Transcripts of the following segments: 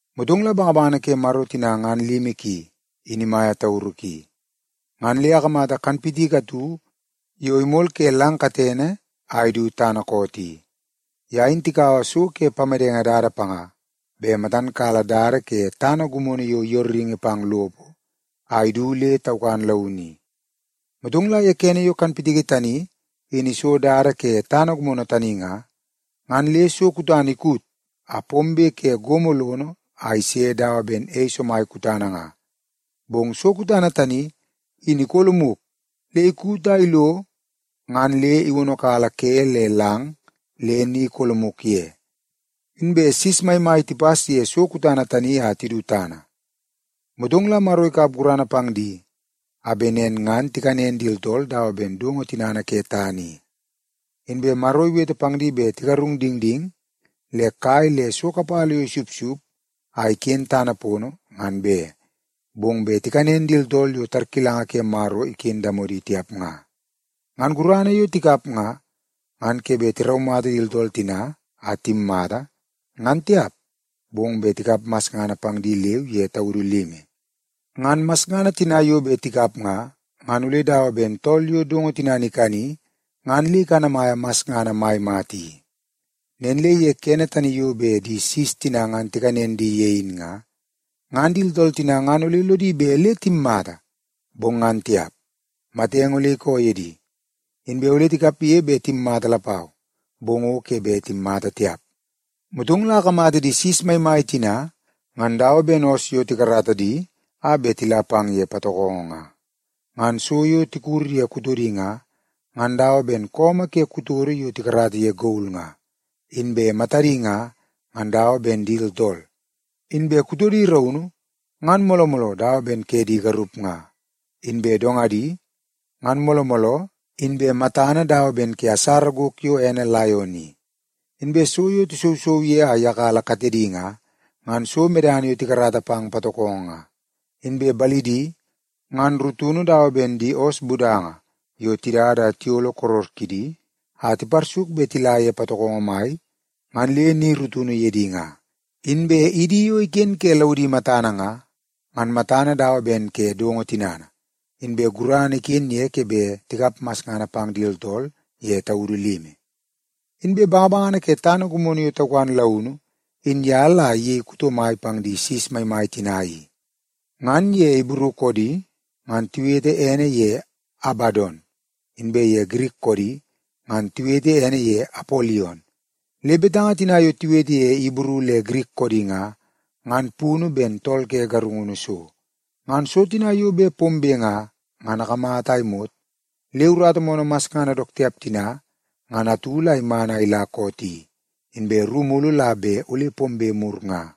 Motong la bangabangana ke Maro tina ngan limi ki, in imaia tauru ki, ngan le akamata kanpitiki atu yo imol ke lang katene a idu tana koot i. Ya in tikaua so ke pamedenge dada panga be matan kala dada ke tana gumono yo yooringi pang lopo a idu le taukan launu i. Motong la ye kene yo kanpitiki tani, in iso dada ke tana gumono tani nga, ngan le so kutana ikut a pombe ke gomo lono a ise dawa ben ei somai kutana nga. Bong so kutana tani, in ikolomuk le ikut a ilo ngan le iwonokala ke le lang le ni ikolomuk ye. Inbe sis maimai tipas ye so kutana tani a tidu tana. Motong la Maro ikap gurana pang di a be nen ngan tikanen di tooltool dawa ben dongo tinana ke tana i. Inbe Maro iwete pang di be tigarung dingding le kai le so kapala yo isupsup a iken tana pono ngan be, bong be tikanen di tooltool yo tarkilanga ke Maro iken ye damodi tiap nga. Ngan gurana yo tikap nga, ngan ke be tiraumata di tooltool tina a timmata, ngan tiap, bong be tikap masngana pang di leu ye taudu limi. Ngan masngana tina yo be tikap nga, ngan ole dawa ben tool yo dongo tinana ikani ngan le ikanamaia masngana mai mata i. Nen le ye kene tani yo be di sis tina ngan tikanen di ye in nga, ngan di tooltool tina ngan ole lodi be le timmata, bong ngan tiap, matenge ole ikoo ye di. Inbe ole tikapye be timmata lapau, bong o ke be timmata tiap. Motong la akamata di sis maimai tina ngan dawa ben oos yo tikarata di a be tila pang ye patokongo nga. Ngan so yo tikur ye kutodi nga, ngan dawa ben koomoo ke kutodo yo tikarata ye gol nga. Inbe matadi nga, ngan dawa ben di tooltool. Inbe kutodi raunu, ngan mooloo mooloo dawa ben ke di garup nga. Inbe dongadi, ngan mooloo mooloo inbe matana dawa ben ke asara gok yo ene laion i. Inbe so yo tisousou ye a iyakala katedi nga, ngan so medana yo tikarata pang patokongo nga. Inbe balidi, ngan rutunu dawa ben di oos budanga yo tidada a tiyolo koror kidi a tiparsuk be tila ye patokongo mai ngan le ni rutunu ye di nga. Inbe idi yo iken ke laudi matana nga, ngan matana dawa ben ke dongo tinana, inbe gurana iken ye ke be tikap masngana pang di tooltool ye taudu limi. Inbe bangabangana ke tana gumono yo taukan launu in ya la iyei tool kuto mai pang di sis maimai tina i. Ngan ye Ibru koodi ngan tiwete ene ye Abadon, inbe ye Girik koodi ngan tiwete ene ye Apolion. Le betanga tina yo tiwete ye Ibru le Girik koodi nga, ngan punu ben Tool Ke Garungunu So. Ngan so tina yo be pombe nga, ngan akamata a imot le urata moonoo masngana dook tiap tina ngan atu la iman a ila koot i, inbe ru mulu la be ole pombe mur nga.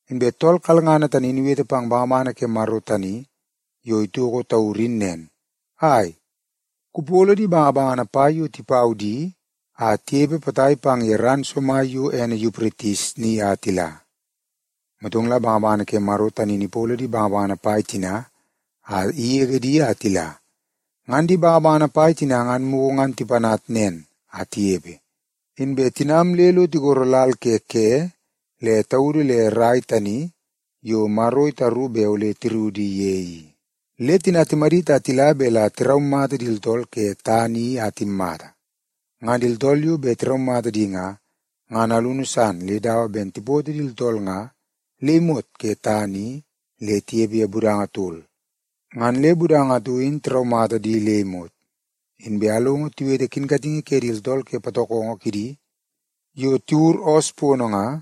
Inbe tool kalngana tani in iwete pang bangabangana ke Maro tani yo itoko tauru in nen, “Ai, kupolo di bangabangana pai yo tipau di a tiyepe potai pang ye ran somai yo ene Yupritis ni a tila.” Motong la bangabangana ke Maro tani in ipolo di bangabangana pai tina a iyege di a tila. Ngan di bangabangana pai tina ngan muku ngan tipanat nen a tiyepe, inbe tinam le lo tigoro lal ke ke le taudu le rai tani yo Maro itaru be ole tiruwu di ye i. Le tina timadit a tila be la tiraumata di tooltool ke tana i a timmata. Ngan di tooltool yo be tiraumata di nga, ngan alunu san le dawa ben tipoto di tooltool nga le imot ke tana i le tiyepe ye budanga tol, ngan le budanga atu in tiraumata di le imot. Inbe alongo tiwete kinkatingi ke di tooltool ke patokongo kidi yo tiwur oos pono nga,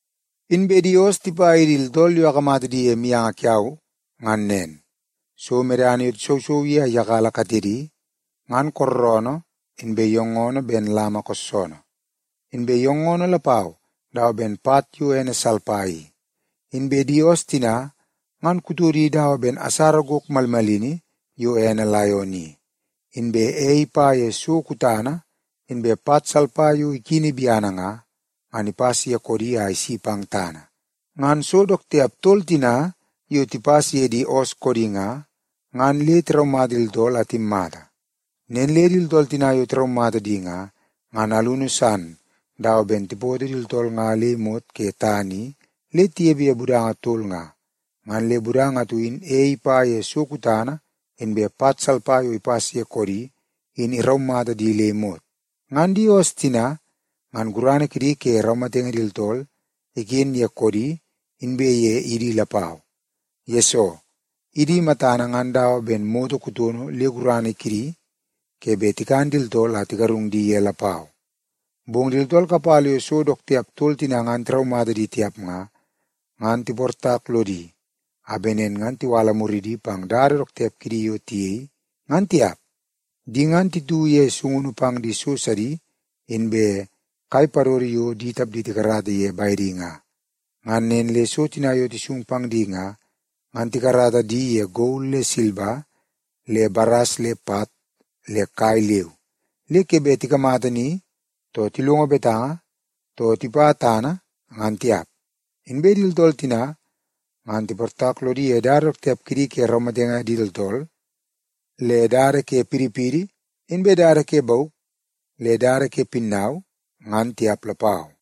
Inbe di oos tipa ye di tooltool yo akamata di ye mianga kiau ngan nen: So medana yo tisousou ye a iyakala katedi, ngan kooroonoo inbe yoongoonoo ben lama koossoonoo, inbe yoongoonoo lapau dawa ben pat yo ene salpa i. b Inbe di oos tina, ngan kutodi dawa ben asara gok malmalini yo ene laion i, inbe ei ipa ye so kutana inbe pat salpa yo ikini biana nga, ngan tipas ye koodi a isi pang tana. Ngan so dook tiap tol tina yo tipas ye di oos koodi nga, ngan le tiraumata di tooltool a timmata. Nen le di tooltool tina yo tiraumata di nga, ngan alunu san dawa ben tipoto di tooltool nga le imot ke tana i le tiyepe ye budanga tol nga, ngan le budanga atu in ei ipa ye so kutana inbe pat salpa yo ipas ye koodi, in iraumata di le imot. Ngan di oos tina, ngan gurana kidi ke raumatenge di tooltool iken ye koodi inbe ye idi lapau, yesoo idi matana ngan dawa ben moto kutono le gurana kidi ke be tikan di tooltool a tigarung di ye lapau. Bong di tooltool kapala yo so dook tiap tol tina ngan tiraumata di tiap nga, ngan tiportak lodi a be nen ngan tiwala muridi pang dada dook tiap kidi yo tiyei ngan tiap. Di ngan titu ye sungunu pang di so sadi inbe kai padodo yo di tapdi tikarata di ye baedi nga. Ngan nen le so tina yo tisung pang di nga, ngan tikarata di ye gol le silba le baras le pat le kai leu, le ke be tikamata ni, too tilongo betanga, too tipa tana, ngan tiap. Inbe di tooltool tina, ngan tiportak lodi ye dada dook tiap kidi ke raumatenge di tooltool, le dada ke pidipidi, inbe dada ke bauk, le dada ke pinnau, ngan tiap lapau.